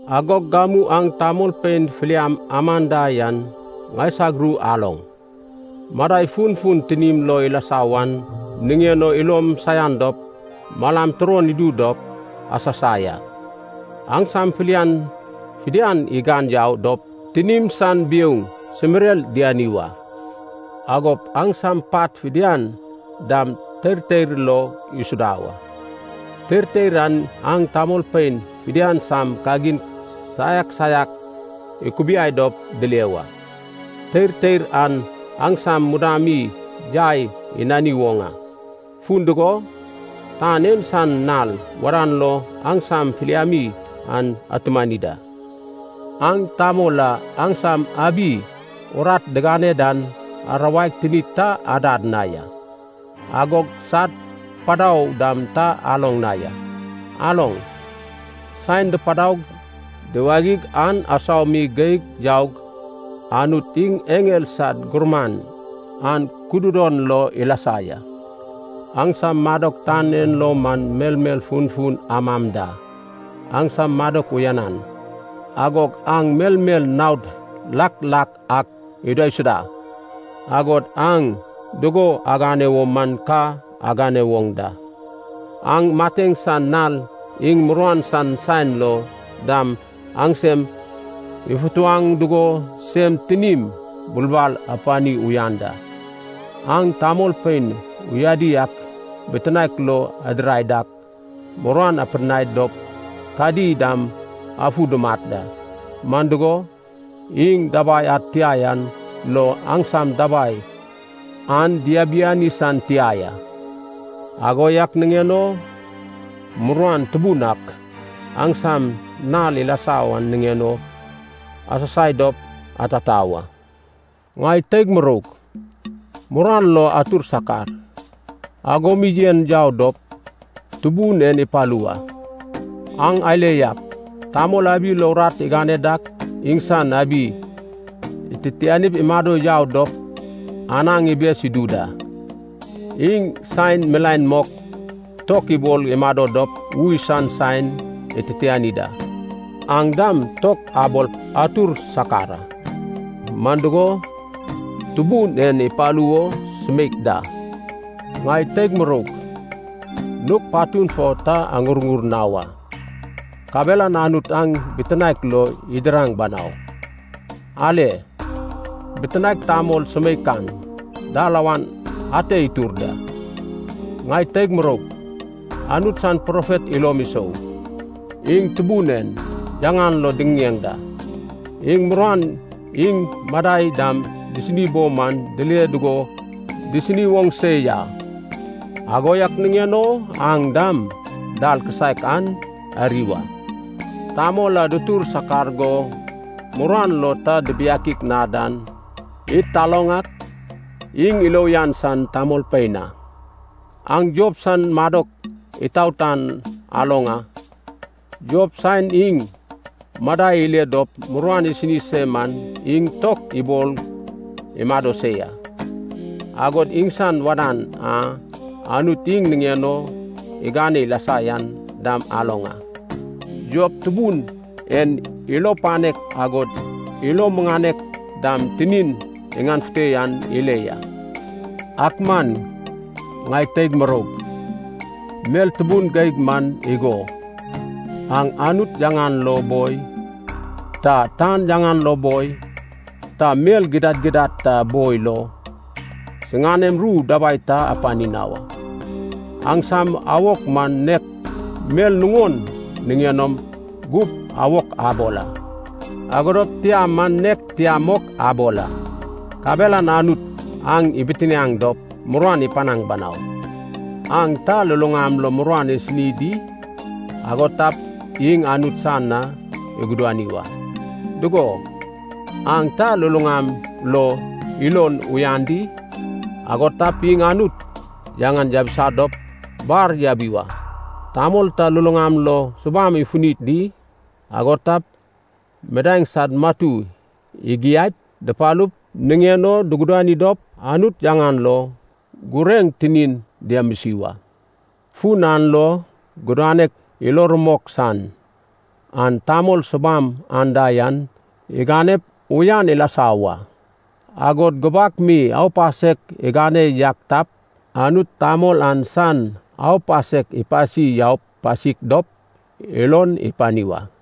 Agog gamu aŋ tamolpein filiam amam da yan ŋaisag ru aloŋ. Madai funfun tinim lo ilasa wan niŋen o ilom saian dop malam turon idu dop asasai a. Aŋsam filian fidian igan yau dop tinim san biouŋ simirer diani wa. Agop aŋsam pat fidian dam teirteir lo isuda wa. Teirteir an aŋ tamolpein fidian sam kagin saiak saiak ikubiai dop dile wa. Teirteir an aŋsam mudam mi yai inani woŋ a. Fun dugo, tan en san nal wadan lo aŋsam filiami an atumani da. Aŋ tamol a aŋsam abi urat digane dan arawaig tinid ta adad na ya. Agog sad padau dam ta aloŋ na ya. Aloŋ, saen dipadaug diwagiŋ an asau mi geig yaug, Anut iŋ eŋel sad Gurman an kududon lo ilasa ya. Aŋsam madok tan en lo man melmel funfun amam da, aŋsam madok uyanan, agog aŋ melmel naod lak lak ak idaisuda, agod aŋ dugo agane wo man ka agane woŋ da. Aŋ mateŋ san nal iŋ muruan san saen lo dam aŋsem ifutuwaŋ dugo sem tinim bulbal apani uyan da. Aŋ tamolpein uyadi ak bitinaek lo adirai dak muruan apidinai dop kadi dam afu dumat da, man dugo, iŋ dabai ad tia yan lo aŋsam dabai an diabiani san tia ya. Ago yak niŋen o muruan tubun ak aŋsam na ilasa wan niŋen o asasai dop atata wa. Ŋai teig muroug, muruan lo atur sakar, ago mi yen yau dop Tubun en ipalu wa. Aŋ ale yak, tamol abi lo urat igane dak iŋsan abi ititianip imado yau dop anaŋ ibes idu da. Iŋ saen milaen mok tok ibol imado dop ui san saen ititiani da. Aŋ dam tok abol atur sakar a. Man dugo, Tubun en ipalu wo sumeik da. Ŋai teig muroug, nug patun fo ta aŋurŋur na wa, kabelan Anut aŋ bitinaek lo idiraŋ banau. Ale, Bitinaek Tamol sumeikan dalawan ate itur da. Ŋai teig muroug, Anut san profet ilom isou, iŋ Tubun en yaŋan lo diŋiŋeŋ da. Iŋ muruan iŋ madai dam disini bo man dile dugo disini woŋ se ya, ago yak niŋen o aŋ dam dal kisaek an ari wa. Tamol a dutur sakar go muruan lo ta dibiakik na dan, id taloŋ ak, iŋ ilo uyan san tamolpein a. Aŋ Job san madok itaot an aloŋ a. Job saen iŋ madai ile dop muruan isini se man iŋ tok ibol imado se ya. Agod iŋsan wadan a Anut iŋ niŋen o igane ilasa yan dam aloŋ a. Job Tubun en ilo panek agod ilo muŋanek dam tinin iŋanefute yan ile ya. Ak man, ŋai teig muroug, mel tubun geig man igo, aŋ Anut yaŋan lo boi, ta tan yaŋan lo boi, ta mel gidad gidad ta boi lo siŋanem ru dabai ta apani na wa. Aŋsam awok man nek mel nuŋon niŋen o gup awok abol a, ago dop tia man nek tia mok abol a. Kabelan Anut aŋ ibitianaŋ dop muruan ipanaŋ banau. Aŋ ta luluŋam lo muruan isini di? Ago tap iŋ Anut san na igudani wa. Dugo, aŋ ta luluŋam lo ilon uyan di? Ago tap iŋ Anut yaŋan yabisa dop bar yabi wa. Tamol ta luluŋam lo subam ifuni di? Ago tap midaeŋ sad matu igiaip, dupalup, niŋen o dugudani dop Anut yaŋan lo gureŋ tinin diamisi wa. Fun an lo gudanek ilo rumok san, an tamol subam anda yan iganep uyan ilasa wa. Agod gubak mi aupasek igane yak tap, Anut tamol an san aupasek ipasi yau pasik dop ilon ipani wa.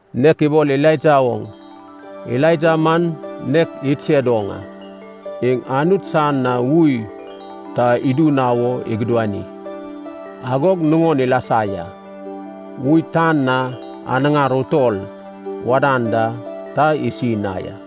Nek ibol Elaija oŋ, Elaija man nek idsed oŋ a. Iŋ Anut san na ui ta idu na wo igudani, agog nuŋon ilasa ya. Ui tan na anaŋar utol wadan da, ta isi na ya.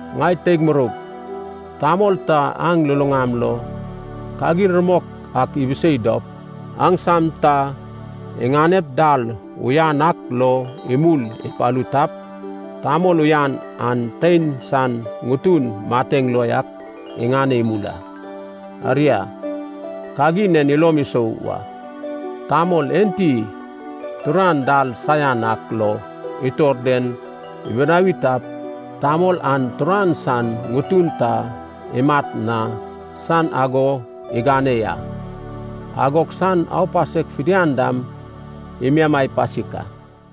Ŋai teig muroug, tamol ta aŋ luluŋam lo kagin rumok ak ibisei dop aŋsam ta iŋanep dal uyan ak lo imul ipalu tap, tamol uyan an tein san ŋutun mateŋ lo yak iŋane imul a. Aria, kagin en ilom isou wa, tamol enti turan dal saian ak lo itor den ibinawi tap, tamol an turan san ŋutun ta imat na san ago igane ya, agog san aupasek fidian dam imiamai pasik a.